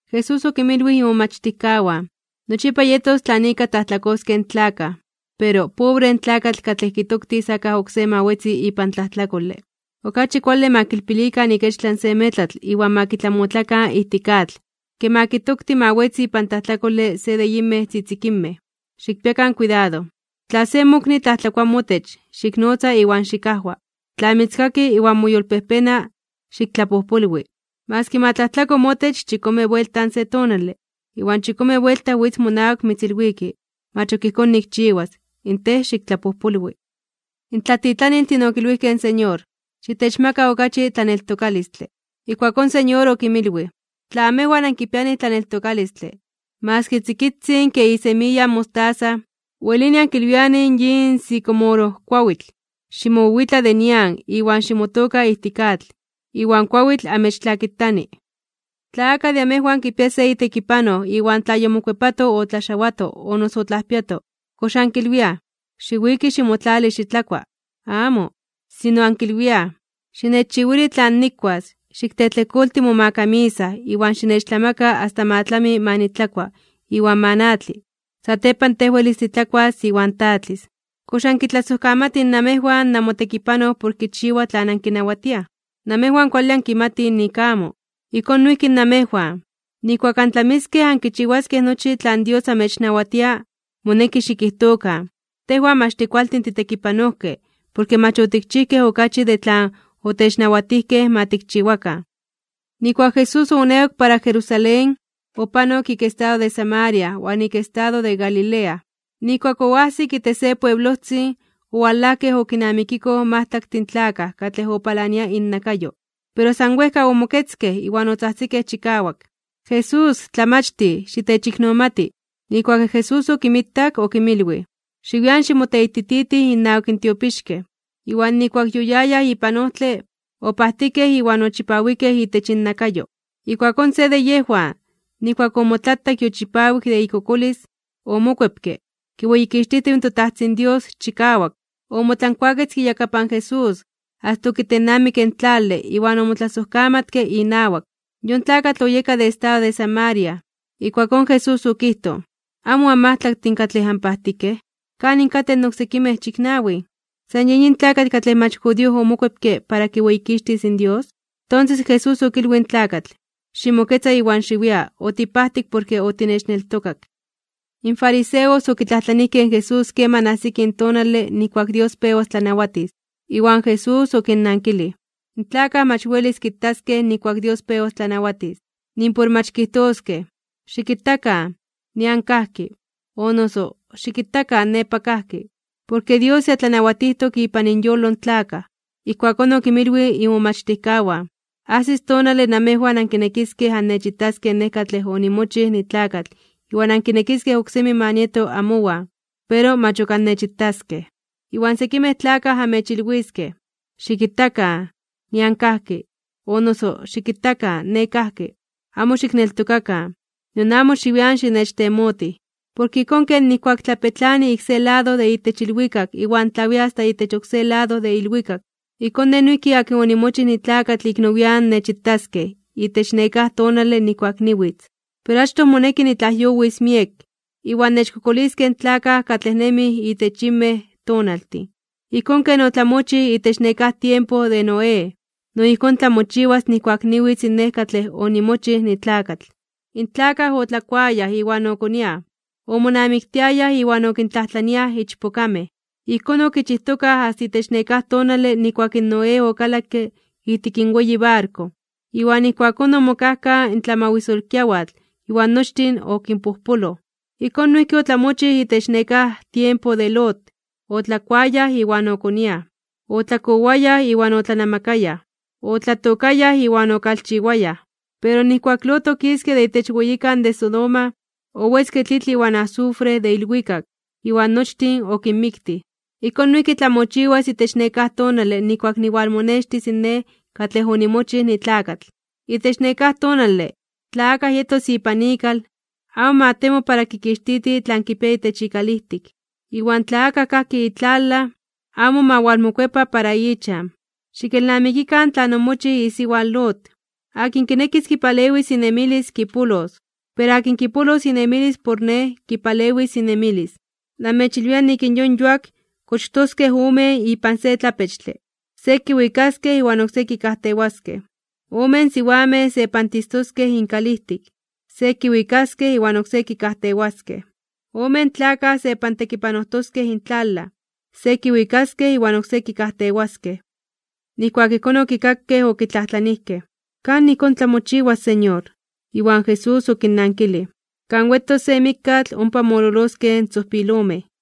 Jesús okinmilwij imomachtijkawan: ―Nochipa yetos tlan ika tlajtlakoskej in tlakaj. Pero ¡pobre in tlakatl katlej kitoktis akaj oksé ma wetzi ipan tlajtlakole! Okachi kuale ma kilpilikan ikechtlan se metlatl iwan ma kitlamotlakan ijtik atl, ke ma kitokti ma wetzi ipan tlajtlakole se de yinmej tzitzikinmej. Xikpiakan kuidado. ’Tla se mokni tlajtlakoa motech, xiknotza iwan xikajwa. Tla mitzkaki iwan moyolpejpena (moyolkuepa), xiktlapojpolwi. Maski ma tlajtlako motech chikome buelta se tonale, iwan chikome buelta witz monawak mitzilwiki: “Mach ok ijkón nikchiwas”, in tej xiktlapojpolwi. In tlatitlaniltin okilwijkej in Señor: ―Xitechmaka okachi tlaneltokalistle. Ijkuakón in Señor okinmilwij: ―Tla amejwan ankipianij tlaneltokalistle, maski tzikitzin kej isemiya in mostaza, welini ankilwianij yin sicomorojkuawitl: “Ximowiwitla de nian iwan ximotooka ijtik atl”, iwan kuawitl amechtlakitani. ’Tla akaj de amejwan kipia se itekipanoj iwan tla yomokuepato otlaxawato o noso otlajpiato, ¿kox ankilwiaj: “Xiwiki ximotlali xitlakua”? Amo, sino ankilwiaj: “Xinechchiwili tlan nikuas, xiktlejtlejkolti momakamisa iwan xinechtlamaka asta ma tlami ma nitlakua iwan ma natli. Satepan tej welis titlakuas iwan tatlis.” ¿Kox ankitlasojkamatij namejwan namotekipanoj por kichiwa tlan ankinawatiaj? Namejwan kuale ankimtij nik amo. Ijkón noijki namejwan, nijkuak antlamiskej ankichiwaskej nochi tlan Dios amechnawatia, moneki xikijtokan: “Tejwan mach tikualtin titekipanojkej, porke mach otikchijkej okachi de tlan otechnawatijkej ma tikchiwakan.” Nijkuak Jesús oonewak para Jerusalén, opanok ik estado de Samaria iwan ik estado de Galilea. Nijkuak oajsik itech se pueblojtzin, owalajkej okinamikikoj majtlaktin tlakaj katlej opalania innakayo, pero san wejka omoketzkej iwan otzajtzikej chikawak: ―¡Jesús, Tlamachtij, xitechiknomati! Nijkuak in Jesús okinmitak, okinmilwij: ―Xiwian ximoteitititij innawak in tiopixkej. Iwan nijkuak yoyayaj ipan ojtle, opajtikej iwan ochipawikej itech innakayo. Ijkuakón se de yejwan, nijkuak omotlatak yochipawik de ikokolis, omokuepke, kiweyikixtijtiw in toTajtzin Dios chikawak. Omotlankuaketzke iyakapan Jesús, asta okitennamikke in tlale iwan omotlasojkamatke inawak. Yon tlakatl oyeka de estado de Samaria. Ijkuakón Jesús okijtoj: ―¿Amo anmajtlaktin katlej anpajtikej? ¿Kanin katej in oksekimej chiknawin? ¿San yen yin tlakatl katlej mach judío omokuepke para kiweyikixtis in Dios? Tonses in Jesús okilwij in tlakatl: ―Ximoketza iwan xiwia. Otipajtik porke otinechneltokak. In fariseos okitlajtlanijkej in Jesús keman ajsis tonale nijkuak Dios pewas tlanawatis. Iwan Jesús okinnankilij: ―In tlakaj mach welis kitaskej nijkuak Dios pewas tlanawatis. Nimpor mach kijtoskej: “Xikitakan, nian kajki”, o noso “Xikitakan nepa kajki”. Porke Dios ya tlanawatijtok ipan inyolo in tlakaj. Ijkuakón okinmilwij imomachtijkawan: ―Ajsis tonale namejwan ankinekiskej annechitaskej Nej katlej onimochij nitlakatl iwan ankinekiskej oksemi ma nieto amowan, pero mach ok annechitaskej. Iwan sekimej tlakaj amechilwiskej: “Xikitakan, nian kajki”, o noso “Xikitakan, ne kajki.” Amo xikneltokakan, nion amo xiwian xinechtemotij. Porke ijkón ken nijkuak tlapetlani ik se lado de itech ilwikak iwan tlawia asta itech oksé lado de ilwikak, ijkón Nej noijki akin onimochij nitlakatl ik nowian (nian nepa) nechitaskej itech nekáj tonale nijkuak niwitz. Pero achtoj moneki nitlajyowis miek, iwan nechkokoliskej in tlakaj katlej nemij itech yinmej tonaltin. Ijkón ken otlamochij itech nekáj tiempo de Noé, no ijkón tlamochiwas nijkuak niwitz Nej katlej onimochij nitlakatl. In tlakaj otlakuayaj iwan okoniaj, omonamiktiayaj iwan okintlajtlaniaj ichpokamej. Ijkón okichijtokaj asta itech nekáj tonale nijkuak in Noé okalakke ijtik in weyi barko, iwan ijkuakón omokajkaj in tlamawisolkiawatl iwan nochtin okinpojpoloj. Ijkón noijki otlamochij itech nekáj tiempo de Lot: otlakuayaj iwan okoniaj, otlakowayaj iwan otlanamakayaj, otlatookayaj iwan okalchiwayaj. Pero nijkuak Lot okiske de itech weyikan de Sodoma, owetzke tlitl iwan azufre de ilwikak, iwan nochtin okinmiktij. Ijkón noijki tlamochiwas itech nekáj tonale nijkuak niwalmonextis Nej katlej onimochij nitlakatl. ’Itech nekáj tonale, tla akaj yetos ipan ikal, amo ma temo para kikixtiti tlan kipia itech ikalijtik. Iwan tla akaj kajki itlalaj, amo ma walmokuepa para ichan. Xikelnamikikan tlan omochij isiwa in Lot. Akin kinekis kipalewis inemilis, kipolos. Pero akin kipolos inemilis por Nej, kipalewis inemilis. ’Namechilwia nik in yon yuak kochtoskej omen ipan se tlapechtle. Se kiwikaskej iwan oksé kikajtewaskej. Omen siwamej sepantistoskej inkalijtik. Se kiwikaskej iwan oksé kikajtewaskej. Omen tlakaj sepantekipanojtoskej intlalaj. Se kiwikaskej iwan oksé kikajtewaskej. Nijkuak ijkón okikakej, okitlajtlanijkej: ―¿Kan ijkón tlamochiwas, Señor? Iwan Jesús okinnankilij: ―Kan wetos se mikkatl, ompa mololoskej in tzojpilomej.